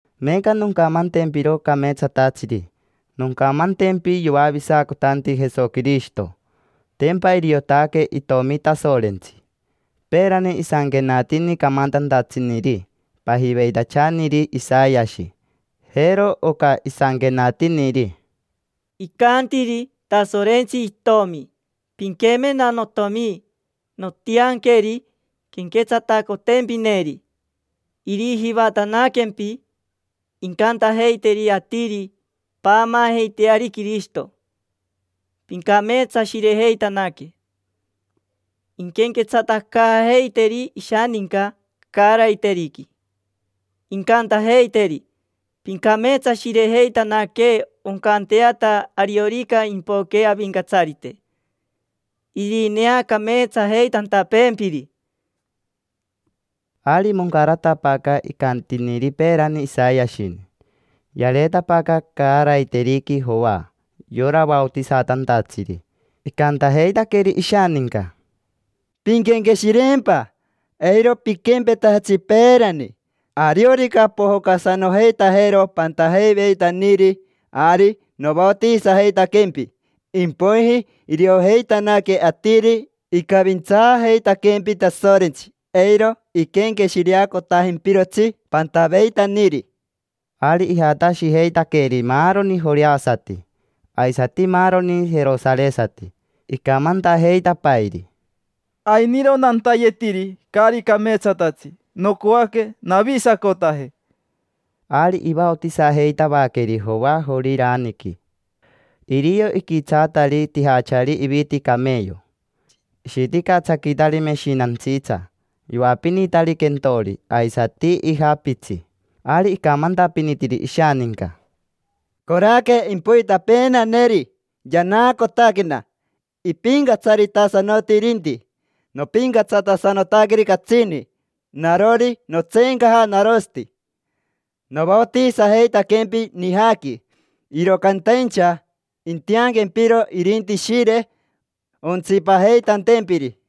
Meeca noncamantempiro cameetsatatsiri. Noncamantempi yoavisacotanti Jesoquirishito. Tempa iriotaque itomi Tasorentsi. Peerani isanquenatini camantantatsiniri pajiveitachaniri Isayashi. Jero oca isanquenatiniri: “Icantiri Tasorentsi itomi: ‘Pinquemena, notiomi. Nontianqueri quenquetsatacotempineri, irijivatanaquempi. Incantajeiteri atiri: Paamaajeiteari Quirishito, pincameetsashirejeitanaque. Inquenquetsatacaajeiteri ishaninca caaraiteriqui. Incantajeiteri: Pincameetsashirejeitanaque oncanteata ariorica impoque Avincatsarite, irineacameetsajeitantapeempiri’”. Ari moncaratapaaca icantiniri peerani Isayashini. Yareetapaaca caaraiteriqui Joa, yora vaotisatantatsiri. Icantajeitaqueri ishaninca: —Pinquenqueshireempa, eiro piquempetajatsi peerani. Ariorica pojocasanojeitajero pantajeiveitaniri, ari novaotisajeitaquempi, impoiji iriojeitanaque atiri icavintsaajeitaquempi Tasorentsi, eiro iquenqueshireacotajimpirotsi pantaveitaniri. Ari ijatashijeitaqueri maaroni joreasati, aisati maaroni jerosaresati, icamantajeitapairi: —Ainiro nantayetiri caari cameetsatatsi. Nocoaque navisacotaje. Ari ivaotisajeitavaqueri Joa Joriraniqui. Irio iquitsaatari tijachari iviti cameyo. Ishiticatsaquitari meshinantsitsa. Yoapinitari quentori aisati ija pitsi. Ari icamantapinitiri ishaninca: —Coraque impoitapeenaneri, yanaacotaquena, ipincatsaritasanoti irinti. Nopincatsatasanotaqueri catsini, narori notseencaja narosati. Novaotisajeitaquempi nijaqui, iro cantaincha intianquempiro irinti Ishire, ontsipajeitantempiri.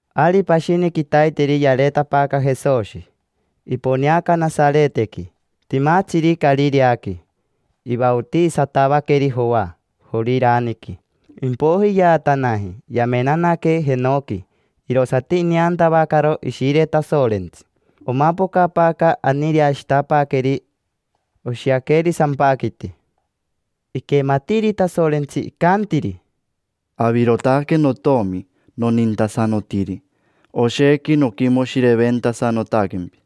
Ari pashini quitaiteri yareetapaaca Jesoshi. Iponeaca Nasaretequi, timatsiri Carireaqui. Ivaotisatavaqueri Joa Joriraniqui, impoiji yaatanaji. Yamenanaque jenoqui, irosati ineantavacaro Ishire Tasorentsi. Omapocapaaca aniireashitapaaqueri, oshiaqueri sampaquiti. Iquematiiri Tasorentsi icantiri: —Avirotaque notomi nonintasanotiri. Oshequi noquimoshireventasanotaquempi.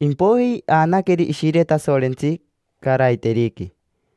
Impoiji aanaqueri Ishire Tasorentsi caaraiteriqui.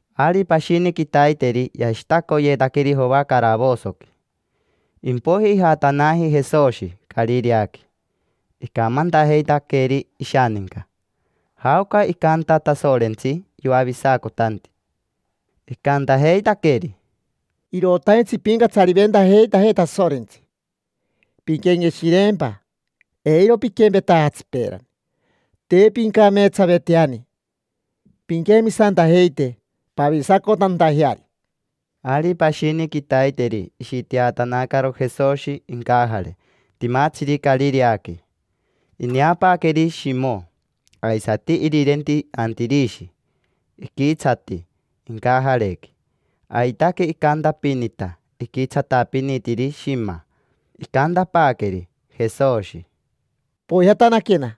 Ari pashini quitaiteri yashitacoyeetaqueri Joa caravosoqui. Impoiji ijatanaji Jesoshi Carireaqui. Icamantajeitaqueri ishaninca jaoca icanta Tasorentsi yoavisacotanti. Icantajeitaqueri: —Irotaintsi impincatsariventajeitajee Tasorentsi. Pinquenqueshireempa, eiro piquempetajatsi peerani: te pincameetsaveiteani. Pinquemisantajeite pavisacotantajeari. Ari pashini quitaiteri ishiteatanacaro Jesoshi incajare timatsiri Carireaqui. Ineapaaqueri Shimo, aisati irirenti, Antirishi. Iquitsati incajarequi: aitaque icantapinita, iquitsatapinitiri shima. Icantapaaqueri Jesoshi: —Poijatanaquena,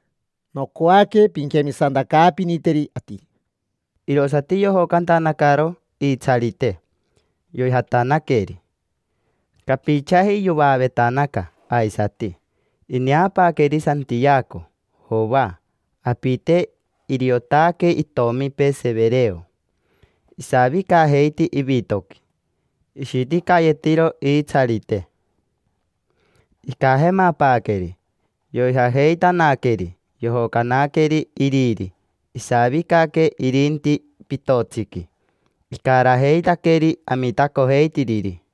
nocoaque pinquemisantacaapiniteri atiri. Irosati yojocantanacaro iitsarite, yoijatanaqueri. Capichaji yovaavetanaca aisati, ineapaaqueri Santiaco, Joa, apite: iriotaque itomipee Severeo. Isavicajeiti ivitoqui, ishiticayetiro iitsarite. Icajemapaaqueri, yoijajeitanaqueri. Yojocanaqueri iriri, isavicaque irinti pitotsiqui, icarajeitaqueri amitacojeitiriri.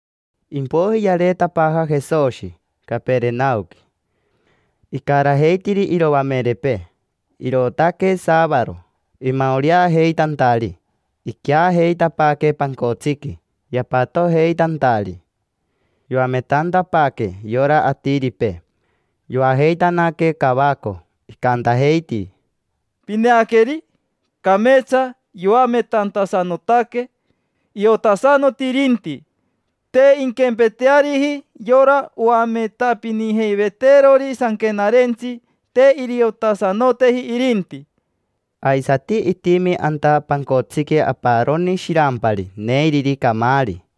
Impoiji yareetapaaja Jesoshi Caperenaoqui, icarajeitiri iroamerepee. Irootaque saavaro, imaoreajeitantari, iqueajeitapaaque pancotsiqui yapatojeitantari. Yoametantapaaque. Yora atiripee, yoajeitanaque cavaco, icantajeiti: —Pineaqueri, cameetsa yoametantasanotaque, iotasanoti irinti. Te inquempeteariji yora oametapinijeiveteerori sanquenarentsi: te iriotasanoteji irinti. Aisati itimi anta pancotsiqui aparoni shirampari neiriri camaari.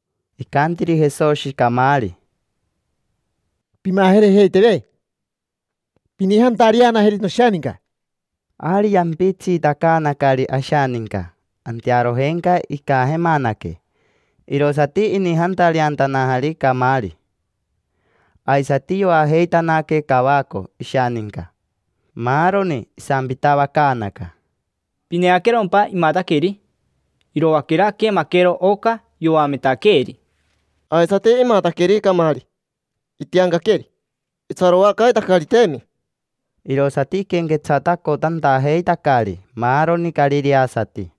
Icantiri Jesoshi camaari: —Pimajereiteteve. Pinijantareanajeri noshaninca. Ari yampitsiitacaanacari ashaninca, antearojenca icajemanaque, irosati inijantareantanajari camaari. Aisati yoajeitanaque cavaco ishaninca, maaroni. Isampitavacaanaca: —¿Pineaquerompa imataqueri? Iroaquera aquemaquero oca yoametaqueeri. Aisati imataqueri camaari, itiancaqueri: itsaroacaitacariteemi. Irosati iquenquetsatacotantajeitacari maaroni carireasati.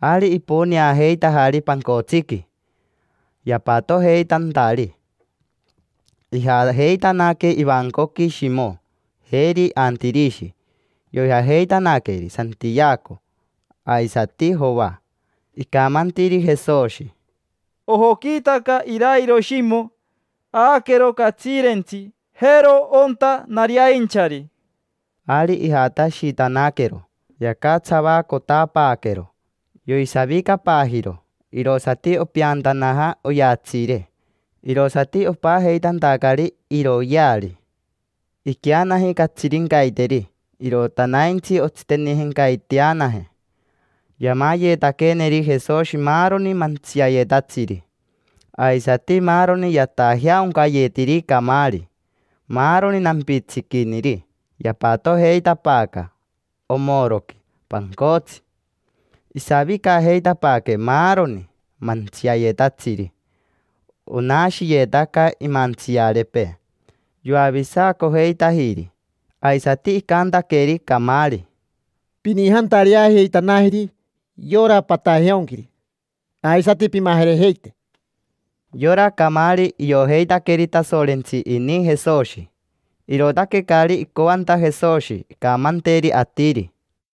Ari iponeajeitajari pancotsiqui yapatojeitantari, ijajeitanaque ivancoqui Shimo, jeri Antirishi. Yoijajeitanaqueri Santiaco aisati Joa. Icamantiri Jesoshi: —Ojoquiitaca irairo Shimo, aaquero catsiirentsi. Jero onta nariainchari. Ari ijatashitanaquero, yacatsavacotapaaquero, yoisavicapaajiro. Irosati opeantanaja ovatsiire, irosati opajeitantacari iroyeari. Iqueanaji catsirincaiteri, irotanaintsi ontsitenijencaiteanaje, yamayetaqueneri Jesoshi maaroni mantsiayetatsiri, aisati maaroni yatajeaoncayetiri camaari. Maaroni nampitsiquiniri yapatojeitapaaca omoroqui pancotsi. Isavicajeitapaaque maaroni mantsiayetatsiri, onashiyetaca imantsiarepee. Yoavisacojeitajiri. Aisati icantaqueri camaari: —Pinijantareajeitanajeri yora patajeaonquiri, aisati pimajerejeite. Yora camaari, iojeitaqueri Tasorentsi ini Jesoshi, irootaque caari icoanta Jesoshi incamanteri atiri.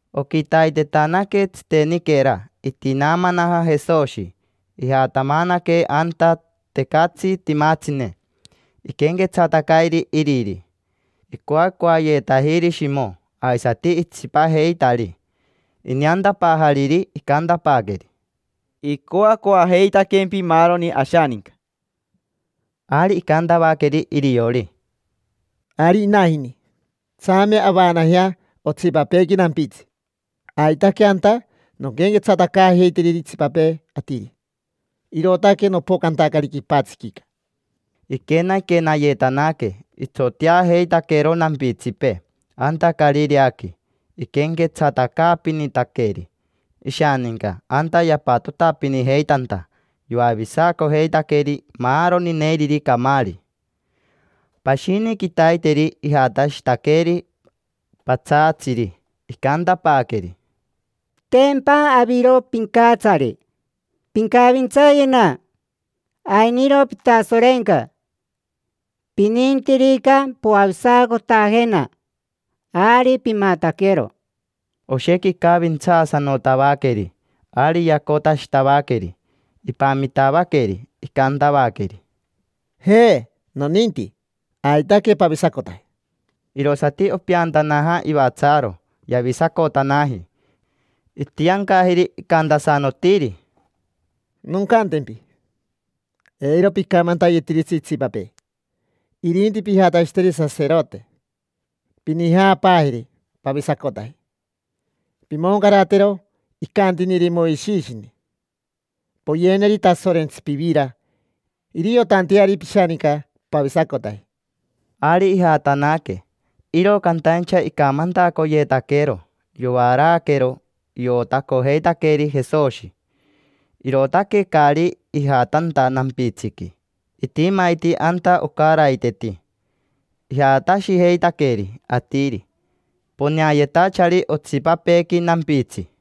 Oquitaitetanaque, tsiteniquera itinaamanaja Jesoshi. Ijatamanaque anta tecatsi timatsine, iquenquetsatacairi iriri. Icoacoayetajiri Shimo aisati itsipajeitari. Ineantapaajariri, icantapaaqueri: —Icoacoajeitaquempi maaroni ashaninca. Ari icantavaqueri iriori: —Ari inajini. Tsame avaanajea otsipapeequi nampitsi. Aitaque anta nonquenquetsatacaajeiteri itsipapee atiri, irootaque nopocantacari quipatsiquica. Iquenaquenayetanaque, itsoteajeitaquero nampitsipee anta Carireaqui. Iquenquetsatacaapinitaqueri ishaninca anta yapatotapinijeitanta, yoavisacojeitaqueri maaroni neiriri camaari. Pashini quitaiteri ijatashitaqueri patsaatsiri, icantapaaqueri: —Tempa aviro pincatsari, pincavintsayena. Ainiro pitasorenca: pinintirica poavisacotajena, ari pimataquero. Oshequi icavintsaasanotavaqueri. Ari yacotashitavaqueri, ipamitavaqueri. Icantavaqueri: —Je, noninti: aitaque pavisacotaje. Irosati opeantanaja ivatsaaro, yavisacotanaji. Itiancajiri, icantasanotiri: —Noncantempi: eiro picamantayetiritsi itsipapee, irinti pijatashiteri saserote. Pinijaapaajeri pavisacotaji. Pimoncaratero icantiniri Moishishini: poyeneri Tasorentsi pivira iriotanteari pishaninca pavisacotaji. Ari ijatanaque, iro cantaincha icamantacoyetaquero, yovaraaquero. Iotacojeitaqueri Jesoshi, irootaque caari ijatanta nampitsiqui. Itimaiti anta ocaraiteti. Ijatashijeitaqueri atiri poneayetachari otsipapeequi nampitsi.